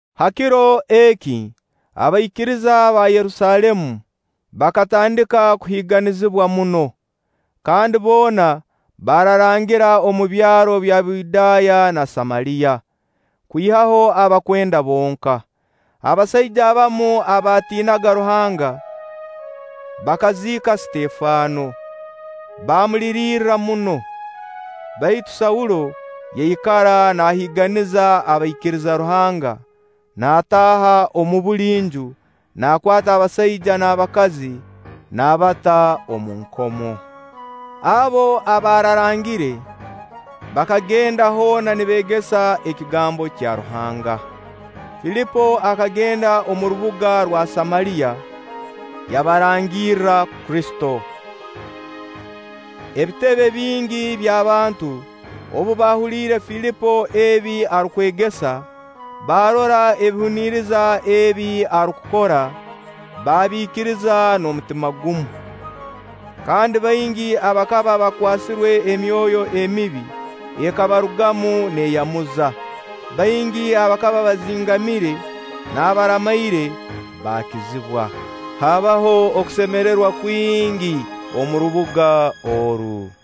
Ha kiro eki, abaikiriza aba Yerusaalemu bakatandika kuhiiganizibwa muno; kandi boona baararangira omu byaro bya Buyudaaya na Samaliya, kwihaho abakwenda bonka. Abasaija abamu abaatiinaga Ruhanga bakaziika Sitefano, baamulirirra muno. Baitu Saulo yaikara naahiiganiza abaikiriza Ruhanga naataaha omu buli nju, naakwata abasaija n'abakazi, naabata omu nkomo. Abo abaararangire, bakagenda hoona nibeegesa ekigambo kya Ruhanga. Filipo akagenda omu rubuga rwa Samaliya yabarangirra Kristo. Ebitebe bingi by'abantu, obu baahuliire Filipo ebi arukwegesa, baarora ebihuniriza ebi arukukora, baabiikiriza n'omutima gumu. Kandi baingi abakaba bakwasirwe emyoyo emibi, ekabarugamu neeyamuza. Baingi abakaba bazingamire n'abaramaire baakizibwa. Haabaho okusemererwa kwingi omu rubuga oru.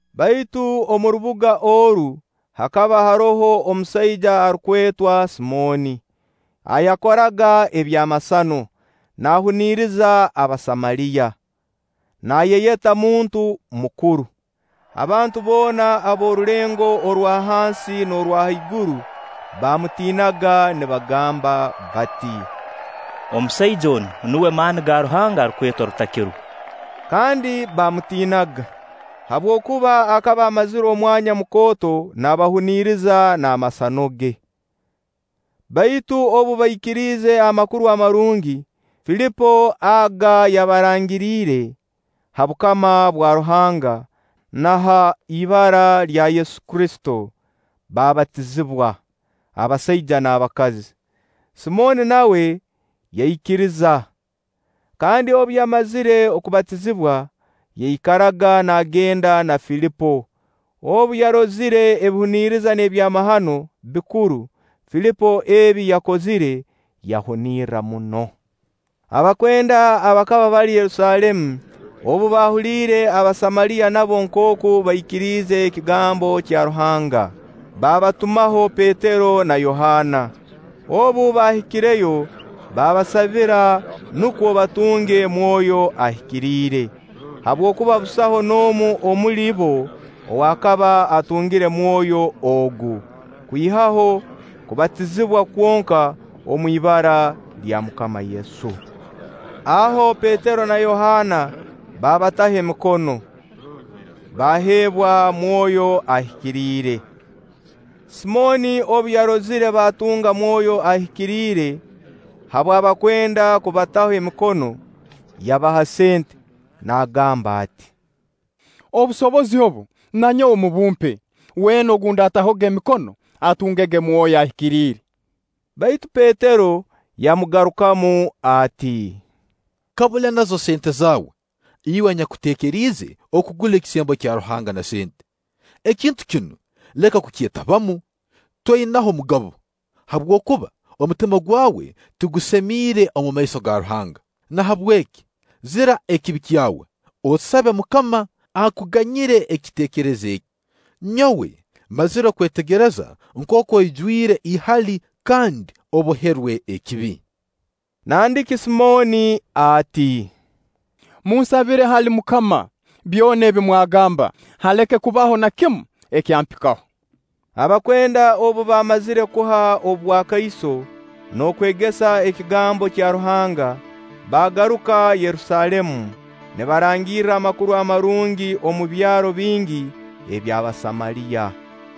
Baitu omu rubuga oru hakaba haroho omusaija arukwetwa Simooni, ayakoraga eby'amasano, naahuniriza Abasamaliya, naayeyeta muntu mukuru. Abantu boona ab'orulengo orwa hansi n'orwa haiguru baamutiinaga nibagamba bati: “Omusaija onu nuwe maani ga Ruhanga arukwetwa Rutakirwa.” Kandi baamutiinaga, habwokuba akaba amazire omwanya mukooto naabahuniriza n'amasano ge. Baitu obu baikiriize Amakuru Amarungi, Filipo aga yabarangiriire ha bukama bwa Ruhanga na ha ibara lya Yesu Kristo, baabatizibwa, abasaija n'abakazi. Simooni nawe yaikiriza, kandi obu yamazire kubatizibwa, yaikaraga naagenda na Filipo. Obu yarozire ebihuniriza n'ebyamahano bikuru Filipo ebi yakozire, yahunirra muno. Abakwenda abakaba bali Yerusaalemu obu baahuliire Abasamaliya nabo nkooku baikiriize ekigambo kya Ruhanga, baabatumaho Petero na Yohaana. Obu baahikireyo baabasabira nukwo batunge Mwoyo Ahikiriire; habwokuba busaho n'omu omuli bo ow'akaba atungire Mwoyo ogu, kwihaho kubatizibwa kwonka omu ibara lya MUKAMA Yesu. Aho Petero na Yohaana baabataho emikono, baaheebwa Mwoyo Ahikiriire. Simooni obu yarozire baatunga Mwoyo Ahikiriire habw'abakwenda kubataho emikono, yabaha sente, naagamba ati: “Obusobozi obu na nyowe mubumpe, weena ou ndaatahoga emikono, atungege Mwoyo Ahikiriire.” Baitu Petero yamugarukamu ati: “Kabule nazo sente zaawe, iwe anyakutekeriize kugura ekisembo kya Ruhanga na sente! Ekintu kinu leka kukyetabamu, toinaho mugabo, habwokuba omutima gwawe tigusemiire omu maiso ga Ruhanga. Nahabweki zira ekibi kyawe, osabe MUKAMA akuganyire ekiteekerezo eki. Nyowe mmazire kwetegereza nkooku oijwire ihali kandi oboherwe ekibi.” Nandiki Simooni ati: “Munsabire hali MUKAMA, byona ebi mwagamba haleke kubaho na kimu ekyampikaho.” Abakwenda obu baamazire kuha obwakaiso n'okwegesa ekigambo kya Ruhanga, baagaruka Yerusaalemu nibarangirra Amakuru Amarungi omu byaro bingi eby'Abasamaliya.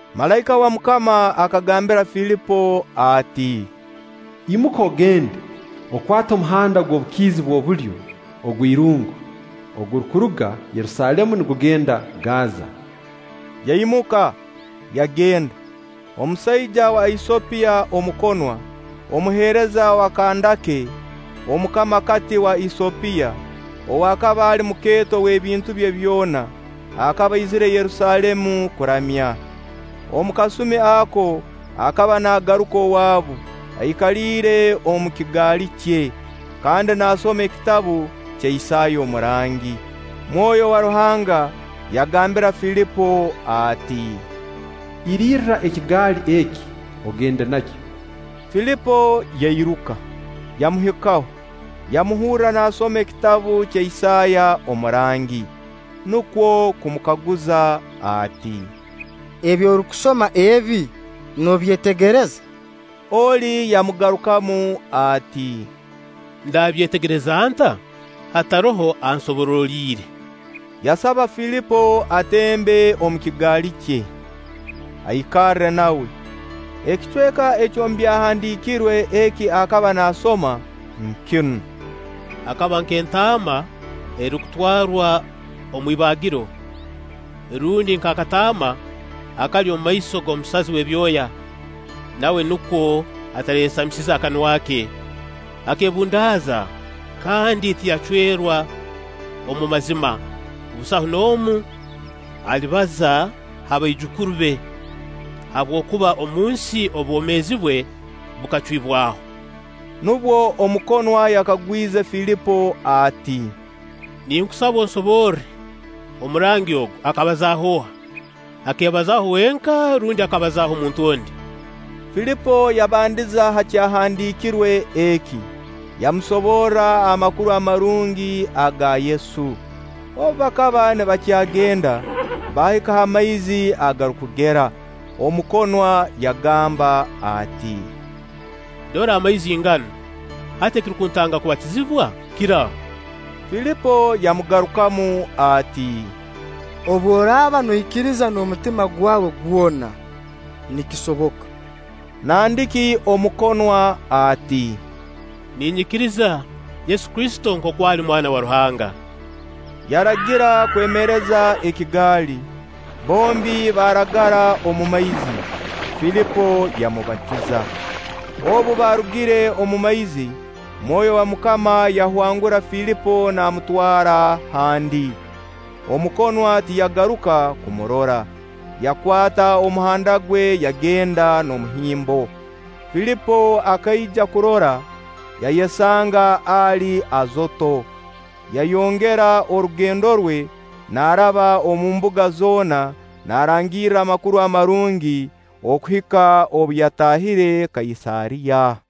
Malaika wa MUKAMA akagambira Filipo ati: “Imuka ogende, okwate omuhanda ogw'obukiizi bw'obulyo, ogw'irungu, ogurukuruga Yerusaalemu nigugenda Gaaza.” Yaimuka, yagenda. Omusaija wa Esiyopiya omukonwa, omuheereza wa Kandaake Omukamakati wa Esiyopiya, ow'akaba ali mukeeto w'ebintu bye byona, akaba aizire Yerusaalemu kuramya. Omu kasumi ako akaba naagaruka owaabu, aikaliire omu kigaali kye, kandi naasoma Ekitabu kya Isaaya omurangi. Mwoyo wa Ruhanga yagambira Filipo ati: “Irirra ekigaali eki, ogende nakyo.” Filipo yairuka, yamuhikaho, yamuhurra naasoma Ekitabu kya Isaaya omurangi, nukwo kumukaguza ati: “Ebi orukusoma ebi, noobyetegereza?” Oli yamugarukamu ati: “Ndabyetegereza nta, hataroho ansoboroliire?” Yasaba Filipo atembe omu kigaali kye, aikarre nawe. Ekicweka eky'omu Byahandiikirwe eki akaba naasoma nkinu: “Akaba nk'entaama erukutwarwa omu ibaagiro; rundi nk'akataama akali omumaiso g'omusazi w'ebyoya. Nawe nukwo atarayesamize kanwa ke. Akeebundaaza kandi tiyacwerwa omu mazima. Busaho n'omu alibaza ha baijukuru be, habwokuba omunsi obwomeezi bwe bukacwibwaho!” Nubwo omukonwa yakagwize Filipo ati: “Ninkusaba onsoborre: omurangi ogu, akabazaaho oha? Akeebazaaho wenka rundi akabazaaho omuntu ondi?” Filipo yabandiza ha kyahandiikirwe eki, yamusoborra Amakuru Amarungi aga Yesu. Obu bakaba nibakyagenda, baahika ha maizi agarukugera, omukonwa yagamba ati: “Dora amaizi nganu! Hati ekirukuntanga kubatizibwa kiraha?” [ Filipo yamugarukamu ati: “Obu oraaba noikiriza n'omutima gwawe gwona, nikisoboka.” Nandiki omukonwa ati: “Ninyikiriza Yesu Kristo nkooku ali Mwana wa Ruhanga.”] Yaragira kwemereza ekigaali, bombi baaragara omu maizi, Filipo yamubatiza. Obu baarugire omu maizi, Mwoyo wa MUKAMA yahwangura Filipo naamutwara handi, omukonwa tiyagaruka kumurora; yakwata omuhanda gwe yagenda n'omuhimbo. Filipo akaija kurora, yayesanga ali Azooto, yayongera orugendo rwe naaraba omu mbuga zoona naarangirra Amakuru Amarungi okuhika obu yataahire Kaisaariya.